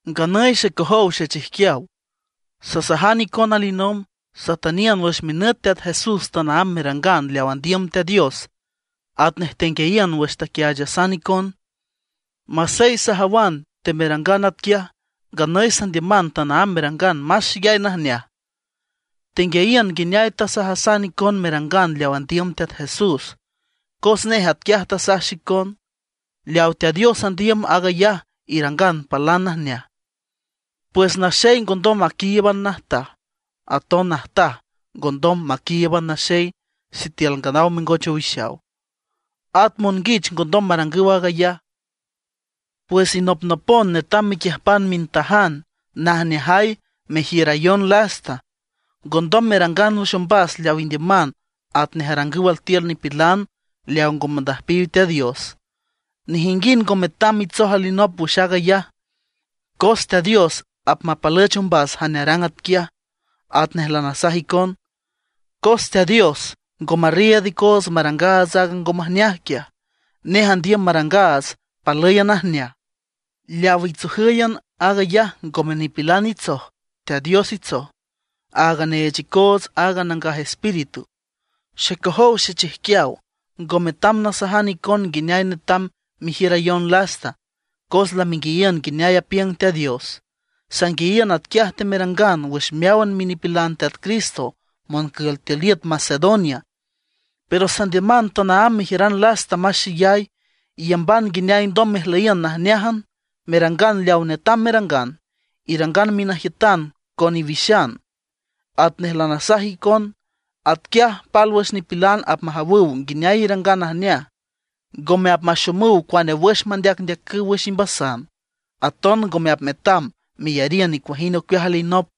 Nganüy xecojow xechijquiaw, sasajan icon alinomb, satüniün wüx minüt Teat Jesús tanaámb merangan leaw andiüm Teat Dios atnej tenguiayiün wüx taquiaachasan icon. Masey sajawan temerangan atquiaj, nganüy sandiüman tanaámb merangan más xeyay najneaj. Tenguiayiün nguineay tasajasan icon merangan leaw andiüm Teat Jesús, cos nej atquiaj tasaj xicon. Leawa Teat Dios andiüm, aag ayaj irangan palan najneaj. Pues naxey ngondom maquíiüban najtaj, at aton najtaj ngondom maquíiüban naxey sitiül nganaw mengoch owixaw; at monguich ngondom marangüw aag ayaj. Pues inopnopon netam mequiüjpan mintajan najneajay mejiürayon lasta; ngondom merangan wüx ombas leaw indiüman atnej arangüw altiül nipilan leawa ngo mandüjpiw Teat Dios. Nejinguind ngo metam mitsoj alinop wüx aag ayaj, cos Teat Dios apmapalüch ombas jane arang atquiaj, atnej lanasajan icon. Cos Teat Dios ngo marriiüd icoots marangaats aaga ngo majneaj quiaj; nej andiüm marangaats palǘyan najneaj. Leaw itsojǘyan aag ayaj ngome nipilan itsoj, Teat Dios itsoj, aaga neech icoots aaga Nangaj Espíritu. Xecojow xechijquiaw, ngo metam nasajan icon nguineay netam mejiürayon lasta, cos lamenguiayiün nguineay apiüng Teat Dios. Sanguiayiün atquiaj temerangan wüx meáwan minipilan Teat Cristo moncül tiül iüt Macedonia. Pero sandiüman tanaámb mejiüran lasta más xeyay. Iyamban nguineay alndom mejlüyiün najneájan, merangan leawa netam merangan; irangan minajiütan con iwixan, atnej lanasajan icon. Atquiaj pálwüx nipilan apmajawüw nguineay irangan najneaj; ngome apmaxomüw cuane wüx mandeacndeacüw wüx imbasan, aton ngome apmetam meyariün nicuajind ocueaj alinop.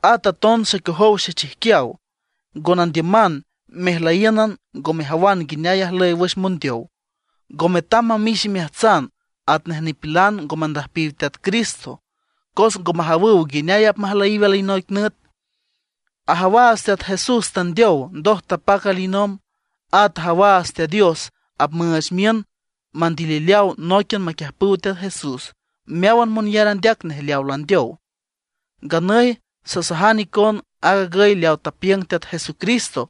At aton xecojow xechijquiaw, ngo nandiüman mejlüyíünan ngo mejawan nguineay ajlüy wüx mondeow. Ngo metam mamix imeajtsan atnej nipilan ngo mandüjpiw Teat Cristo, cos ngo majawüw nguineay apmajlüyiw alinoic nüt. Ajawaats Teat Jesús tandeow, ndoj tapac alinomb. At ajawaats Teat Dios apmüüch miün mandilileaw nóiquian maquiüjpüw Teat Jesús meáwan monyar andeac nej leawa landeow. Nganüy sasajan icon aag agüy leaw tapiüng Teat Jesucristo,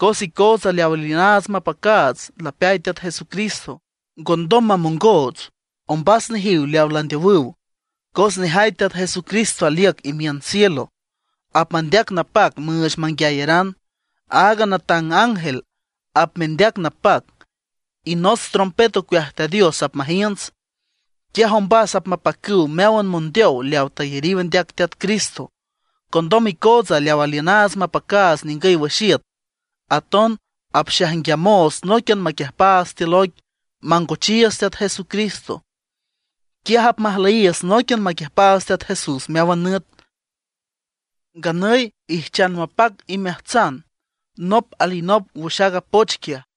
cos icootsa leaw aliünaats mapacaats lapeay Teat Jesucristo, ngondom mamongoots ombas nejiw leawa landeowüw. Cos nejay Teat Jesucristo aliüc imiün cielo, apmandeac napac müüch manguiayaran. Aaga natang ángel apmendeac napac, y nots trompet ocueaj Teat Dios apmajiünts. Quiaj ombas apmapacüw meáwan mondeow leawa tayariw andeac Teat Cristo. Condom icootsa leawa aliünaats mapacaats ningüy wüx iüt, aton apxaijnguiamoots nóiquian maquiüjpaats tiül oic mangochiiüts Teat Jesucristo. Quiaj apmajlüyiiüts nóiquian maquiüjpaats Teat Jesús meáwan nüt. Nganüy ijchan mapac imeajtsan nop alinop wüx aaga poch quiaj.